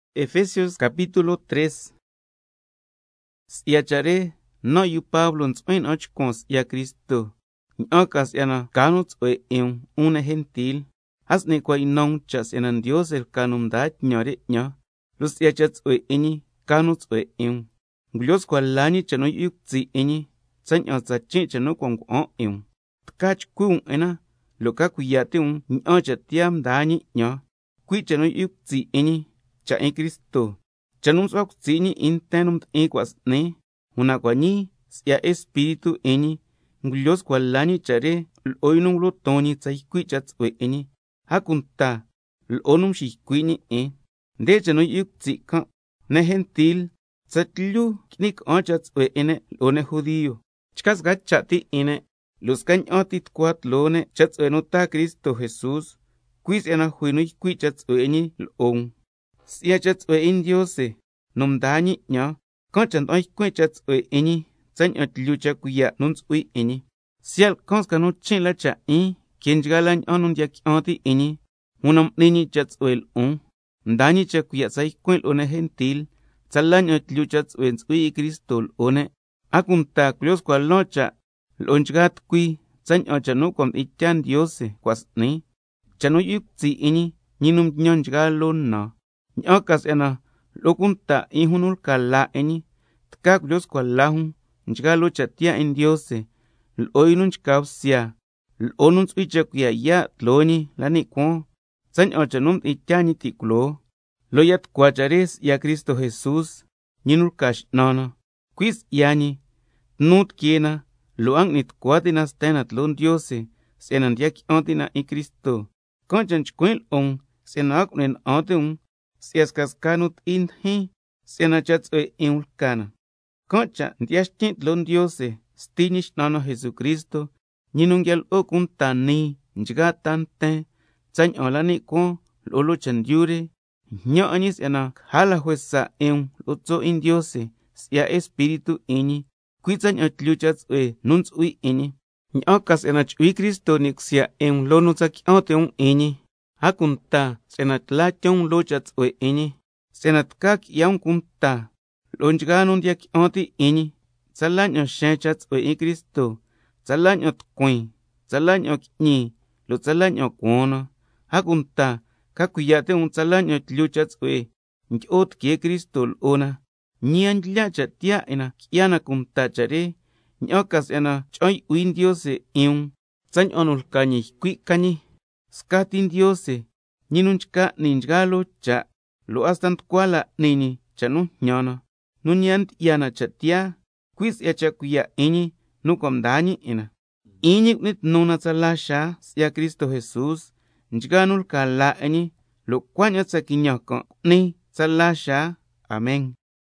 Cui' si'ya cha' re, nan' yu Pablo ntsu'huin na'an chcuan si'ya Cristo, ña'an ca si'yana ca nu tsu'hue 'in um, 'un ne' gentil. A s'ni cua' ynan um cha' si'yana Ndiose lca nu mdaa tñan re 'ñan, lo' si'ya cha' tsu'hue 'in ñi ca nu tsu'hue 'in um. Ngulyo scua la ñi cha' nu yu'hui cutsi' 'in ñi, tsaña'an tsa chin' cha' nu cua' ngua'an 'in um, tca chcui' um 'in na lo' ca cuiya' ti' um tsala ña'an cha' tiyaa mdaa ñi 'ñan, cui' cha' nu yu'hui cutsi' 'in ñi, cha' 'in Cristo, cha' nu msu'hua cutsi' ñi 'in nten nu mdi'in cua' s'ni, una cua' ñii si'ya Espíritu 'in ñi ngulyo scua la ñi cha' re lo'o yu nu ngulo ton ñi tsa ycui' cha' tsu'hue 'in ñi, a cunta lo'o nu nxiycui' ñi 'in. Nde cha' nu yu'hui cutsi' can': Ne' gentil tsatlyu qui'ni ca'an cha' tsu'hue 'in ne' lo'o ne' judio, chca sca cha' ti 'in ne', lo' scaña'an ti tucua tloo ne' cha' tsu'hue nu taa Cristo Jesús, cui' si'yana jui nu ycui' cha' tsu'hue 'in ñi lo'o um. Si'ya cha' tsu'hue 'in Ndiose nu mdaa ñi 'ñan can' cha' nda'an ycuin' cha' tsu'hue 'in ñi, tsaña'an tlyu cha' cuiya' nu ntsu'hui 'in ñi. Siya' lcan sca nu chin' la cha' 'in que nchgaa la ña'an nu ndiya qui'an ti' 'in ñi, una m'ni ñi cha' tsu'hue lo'on mdaa ñi cha' cuiya' tsa ycuin' lo'o ne' gentil, tsala ña'an tlyu cha' tsu'hue ntsu'hui 'in Cristo lo'o ne', a cunta culyo scua lan cha' lo'o nchgaa tucui tsaña'an cha' nu cua' mdi'in tyaa Ndiose cua' s'ni, cha' nu yu'hui cutsi' 'in ñi, ñi nu mtñan nchgaa loo na, ña'an ca si'yana lo'o cunta 'in jun nu lca laa 'in ñi, tca culyo scua la jun nchgaa loo cha' tiyaa 'in Ndiose, lo'o yu nu nchca bsya lo'o nu ntsu'hui cha' cuiya' yaa' tloo ñi la ni' cuaan, tsaña'an cha' nu mdi'in tyaa ñi ti' culoo, lo' ya tucua cha' re si'ya Cristo Jesús, ñi nu lca X'nan na. Cui' si'ya ñi, can' cha' tnu tiquee na lo' a ngui'ni tucua ti' na sten na tloo Ndiose si'yana ndiya qui'an ti' na 'in Cristo. Can' cha' chcuin' lo'o um si'yana a cu'ni na'an ti' um si'ya scasca nu ti'i ndijin si'ya um, si'yana cha' tsu'hue 'in um lca na. Can' cha' ndyi'ya xtyin' tloo Ndiose, Sti Ñi X'nan na Jesucristo, ñi nu nguia lo'o cunta nii nchgaa ta nten, tsaña'an la ni' cuaan lo'o loo chendyu re. Njñan 'in ñi si'yana caja la juesa 'in um lo'o tso' 'in Ndiose si'ya Espíritu 'in ñi, cui' tsaña'an tlyu cha' tsu'hue nu ntsu'hui 'in ñi, ña'an ca si'yana chu'hui Cristo ni' cusya 'in um loo nu tsa qui'an ti' um 'in ñi, a cunta si'yana tla tyon um loo cha' tsu'hue 'in ñi, si'yana tca qui'ya um cunta lo'o nchgaa nu ndiya qui'an ti' 'in ñi, tsala ña'an xeen cha' tsu'hue 'in Cristo, tsala ña'an tucuin, tsala ña'an qui'ñi, lo' tsala ña'an cuaan na, a cunta ca cuiya' ti' um tsala ña'an tlyu cha' tsu'hue ndyi'o tiquee Cristo lo'o na, ñi a ndlya cha' tiyaa 'in na qui'ya na cunta cha' re, ña'an ca si'yana cha'an yu'hui Ndiose 'in um tsaña'an nu lca ñi ycui' ca ñi. Scati Ndiose, ñi nu nchca n'ni nchgaa loo cha', lo' hasta nducua la n'ni ñi cha' nu njñan na, nu ñi a ndyi'ya na cha' tiyaa, cui' si'ya cha' cuiya' 'in ñi nu cua' mdaa ñi 'in na, 'in ñi cu'ni tnu na tsala xaa si'ya Cristo Jesús, nchgaa nu lca laa 'in ñi, lo' cuaña'an tsa quiñan can' cu'ni tsala xaa. Amen.